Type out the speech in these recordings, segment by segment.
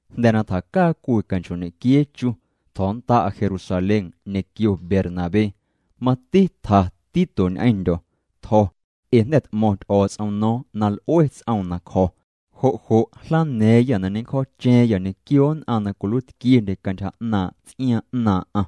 Jnda̱ na tjacaa cwii canchoo'ñequiee chu, tjo̱nnda'a Jerusalén ñequio Bernabé. Mati tja Tito ñ'eⁿndyo̱. Tjo̱ jo' ee jnda̱ t'mo̱ⁿ Ty'o̱o̱ts'om no̱o̱ⁿ na l'ue ts'oom na cjo̱. Jo' jlana̱a̱ⁿyâ na ñencjo̱o̱cha̱a̱ⁿyâ ñequio nn'aⁿ na cwiluiitquiendye cantyja 'naaⁿ' ts'iaaⁿ 'naaⁿ'aⁿ.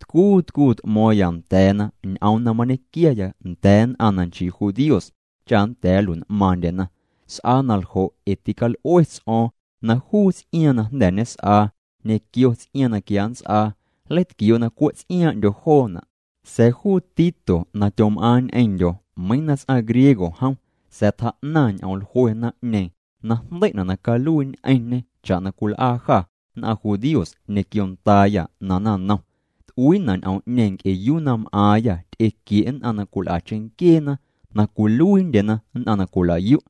Tcuu tcuu t'mo̱o̱ⁿya nda̱a̱na ñ'oom na mañequiaya nda̱a̱ nn'aⁿ na chii judíos cha nda̱a̱ nlui'n'maaⁿndyena. S'aa na ljo' ee tical'ue ts'o̱o̱ⁿ na juu ts'iaaⁿ na jnda̱ ñes'aa ñequio ts'iaaⁿ na quia nnts'aa, nleitquioo' na cwe' tsiaaⁿ'ndyo joona'. Sa̱a̱ juu Tito na tyom'aaⁿ ñ'eⁿndyo̱, meiiⁿ na nchii ts'aⁿ judío jom, tjaa'naⁿ ñ'oom jlue naⁿ'ñeeⁿ na jndei'na' na caluii ñ'eⁿñê cha'na cwil'aa jâ nn'aⁿ judíos ñequio ndaayâ na naⁿnom. T'uiina' ñ'oom'ñeeⁿ nc'e yuu na m'aaⁿyâ ty'equie' nn'aⁿ na cwil'a cheⁿnquieena na cwiluiindyena nn'aⁿ na cwila'yu'.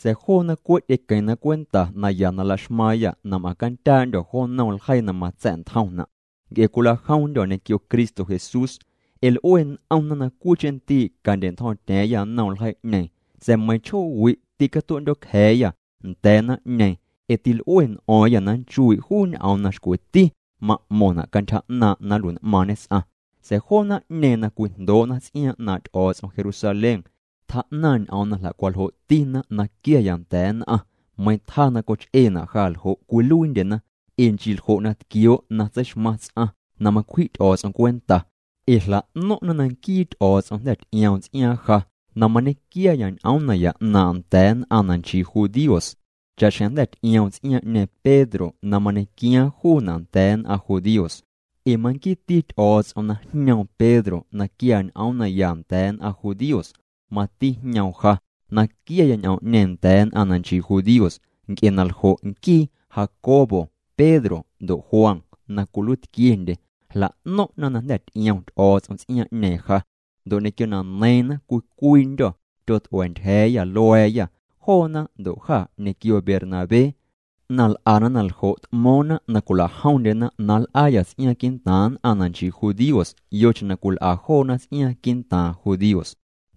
Sa̱a̱ joona cwe' ty'equeⁿna cwenta naya na la'xmaaⁿya na m'aⁿ candyaandyo̱ jo nnom ljeii na matsa̱'ntjomna' nc'e cwila'jomndyo̱ ñequio Cristo Jesús. Ee l'ue n'omna na cwiicheⁿ ndii' candya̱'ntjo̱o̱ⁿtya̱a̱ⁿya nnom ljeii'ñeeⁿ. Sa̱a̱ meiⁿ chjoowi' tîcatue'ndyo̱cja̱a̱yâ̱ nda̱a̱ naⁿ'ñeeⁿ ee til'ue n'o̱o̱ⁿyâ na nnchuii' juu ñ'oom na xcweti ma'mo̱ⁿna' cantyja 'naaⁿ' na nlui'n'maaⁿñe ts'aⁿ. Sa̱a̱ joo naⁿ'ñeeⁿ na cwijndoo'na ts'iaaⁿ 'naaⁿ' Ty'o̱o̱ts'om Jerusalén, tjaa'naⁿ ñ'oom na jla'cwaljoo'tina na quiaaya nda̱a̱ nn'aⁿ. Meiⁿ tjaa na coch'eena' ja ljo' cwiluiindyena, ee nchii cantyja na cwiwitquioo' macwji' Ty'o̱o̱ts'om cwenta chiuu tseixmaⁿ ts'aⁿ. Ee jla'no̱ⁿ'na na nquii Ty'o̱o̱ts'om jnda̱ ty'ioom ts'iaaⁿ ja na mañequiaya ñ'oom naya 'naaⁿ'aⁿ nda̱a̱ nn'aⁿ na nchii judíos, cha'xjeⁿ jnda̱ ty'ioom ts'iaaⁿñeeⁿ Pedro na mañequiaaⁿ juuna' nda̱a̱ nn'aⁿ judíos. Ee manquiiti Ty'o̱o̱ts'om na jñoom Pedro na quiaa ñ'oom naya nda̱a̱ nn'aⁿ judíos, mati jñoom ja na quiaya ñ'oom'ñeeⁿ nda̱a̱ nn'aⁿ na nchii judíos. Nc'e na ljo' nquii Jacobo, Pedro ndo' Juan, na cwiluiitquiendye, jla'no̱ⁿ'na na jnda̱ ty'iom Ty'o̱o̱ts'om ts'iaaⁿ'ñeeⁿ ja, ndo' ñequio na neiiⁿna cwii cwiindyo̱ tyot'ua̱a̱ ntyja̱a̱ya lua̱a̱ya, joona ndo' jâ ñequio Bernabé. Na l'ana na ljo' t'mo̱o̱ⁿna na cwila'jomndyena na nl'aayâ ts'iaaⁿ quii'ntaaⁿ nn'aⁿ na nchii judíos yocheⁿ na cwil'a joona ts'iaaⁿ quii'ntaaⁿ judíos.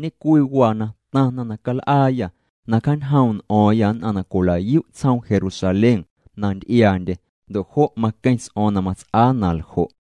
Ñe'cwii waa na taⁿna na cal'aayâ, na cjañjoom' n'o̱o̱ⁿyâ nn'aⁿ na cwila'yu' tsjoom Jerusalén na nty'iaandye, ndo' jo' maqueⁿ ts'o̱o̱ⁿ na mats'aa na ljo'.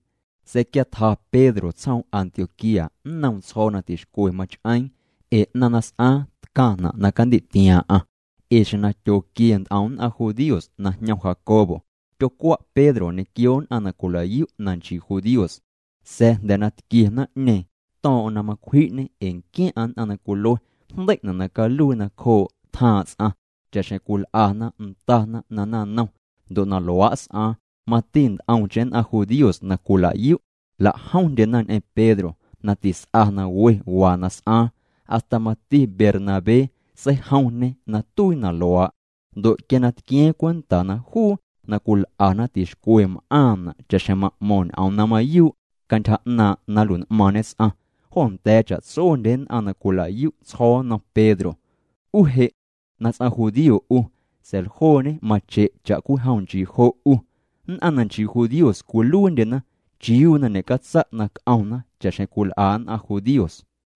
Sa̱a̱ quia tja Pedro tsjoom Antioquía, nnoom tsjo̱o̱ na tixcwe mach'eeⁿ, ee 'naⁿ na s'aaⁿ tcaⁿna' na candi'tiaaⁿ'aⁿ. Ee xjeⁿ na tyooquie nt'om nn'aⁿ judíos na jñom Jacobo, tyocwa' Pedro ñequio nn'aⁿ na cwila'yu' na nchii judíos. Sa̱a̱ jnda̱ na tquie naⁿ'ñeeⁿ, to̱o̱ⁿ'o̱ⁿ na macwji'ñê ee nquiaⁿ'aⁿ nn'aⁿ na cwilue jndei'na' na caluii nacjoo' tjaaⁿ' ts'aⁿ cha'xjeⁿ cwil'ana ndana na naⁿnom. Ndo' na luaa' s'aaⁿ, mati nt'omcheⁿ nn'aⁿ judíos na cwila'yu', jla'jomndyena ñ'eⁿ Pedro na tis'a na we waa na s'aaⁿ, hasta mati Bernabé seijomñe na tuii na luaa'. Ndo' quia na tquia̱a̱ⁿ cwenta na juu na cwil'ana tixcwe m'aaⁿna' cha'xjeⁿ ma'mo̱ⁿ ñ'oom na mayuu' cantyja 'naaⁿ' na nlui'n'maaⁿñe ts'aⁿ, jo nda̱a̱ cha'tsondye nn'aⁿ na cwila'yu' tsjo̱o̱ nnom Pedro: “'U je' na ts'aⁿ judío 'u, sa̱a̱ ljooñe mache' cha'cwijom nchii jo' 'u. Nn'aⁿ na nchii judíos cwiluiindyena, ¿chiuu na ñe'catsa' na c'omna cha'xjeⁿ cwil'a nn'aⁿ judíos?”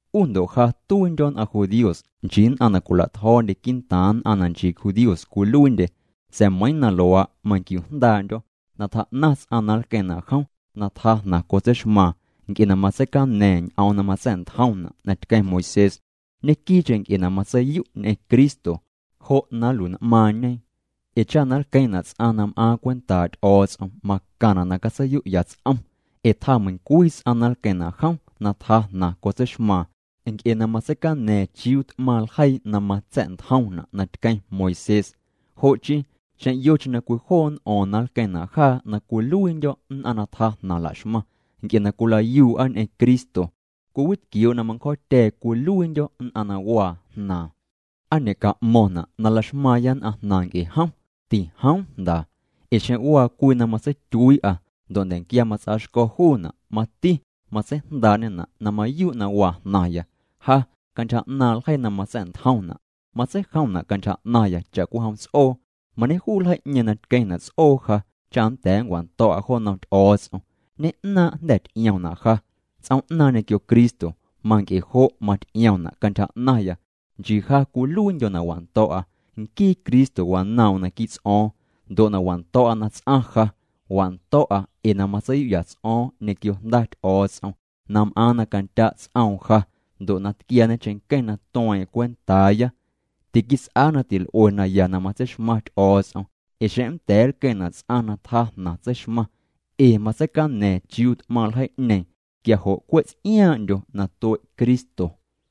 'U ndo' ja tuiindyo̱ nn'aⁿ judíos, nchii nn'aⁿ na cwila'tjo̱o̱ndye quii'ntaaⁿ nn'aⁿ na nchii judíos cwiluiindye. Sa̱a̱ meiiⁿ na luaa', manquiuu jndaa'ndyo̱ na tjaa'naⁿ ts'aⁿ na nlqueⁿna' jom na tjaa jnaⁿ cotseixmaaⁿ nc'e na matseicaña̱a̱ⁿ ñ'oom na matsa̱'ntjomna' na tqueⁿ Moisés, ñequii'cheⁿ nc'e na matseiyu' ñ'eⁿ Cristo, jo' na nlui'n'maaⁿñe. Ee cha na nlqueⁿna' ts'aⁿ na m'aaⁿ cwentaa' Ty'o̱o̱ts'om, macaⁿna' na catseiyu'ya ts'om, ee tjaa meiiⁿcwii ts'aⁿ na nlqueⁿna' jom na tjaa jnaⁿ cotseixmaaⁿ nc'e na matseicaña̱a̱ⁿ chiuu t'maⁿ ljeii na matsa̱'ntjomna' na tqueⁿ Moisés. Jo' chii, xeⁿ yocheⁿ na cwijoo' n'o̱o̱ⁿ na nlqueⁿna' jaa na cwiluiindyo̱ nn'aⁿ na tjaa jnaⁿ la'xmaⁿ nc'e na cwilayuu'a ñ'eⁿ Cristo, cwiwitquioo' na manncjo̱o̱tya̱a̱ cwiluiindyo̱ nn'aⁿ na waa jnaaⁿ, ¿aa ñe'ca'mo̱ⁿna' na la'xmaaⁿya nn'aⁿ jnaⁿ nc'e jom? Tijoom jnda. Ee xeⁿ waa cwii na matsetyuii'a ndo' nda̱nquia mats'aa xco̱ juuna', mati matseijndaa'ñena' na mayuu' waa jnaⁿya. Ja cantyja 'naaⁿ' ljeii na matsa̱'ntjomna', matseijomna' cantyja 'naⁿya cha'cwijom ts'oo, mañejuu ljeii'ñeeⁿ na tqueⁿna' ts'oo ja cha nnda̱a̱ nncwando̱'a jo nnom Ty'o̱o̱ts'om. Ñe'naaⁿ' jnda̱ ty'ioomna' ja ts'oom'naaⁿ ñequio Cristo. Manc'e jo' maty'iomna' cantyja 'naⁿya nchii ja cwiluiindyo̱ na wando̱'a, nquii Cristo wanoom'm naquii' ts'o̱o̱ⁿ. Ndo' na wando̱'a na ts'aⁿ ja, wando̱'a ee na matseiyu'ya ts'o̱o̱ⁿ ñequio Jnda Ty'o̱o̱ts'om na m'aaⁿ na candya' ts'oom ja ndo' na tquiaañe ncheⁿnqueⁿ na tueeⁿ'eⁿ cwentaaya. Tiquits'aa na til'ue naya na matseixmaⁿ Ty'o̱o̱ts'om ee xeⁿ nnda̱a̱ nlqueⁿna' ts'aⁿ na tjaa jnaⁿ tseixmaⁿ ee matseicaña̱a̱ⁿ chiuu t'maⁿ ljeii'ñeeⁿ quia jo' cwe' ts'iaaⁿ'ndyo na tue' Cristo.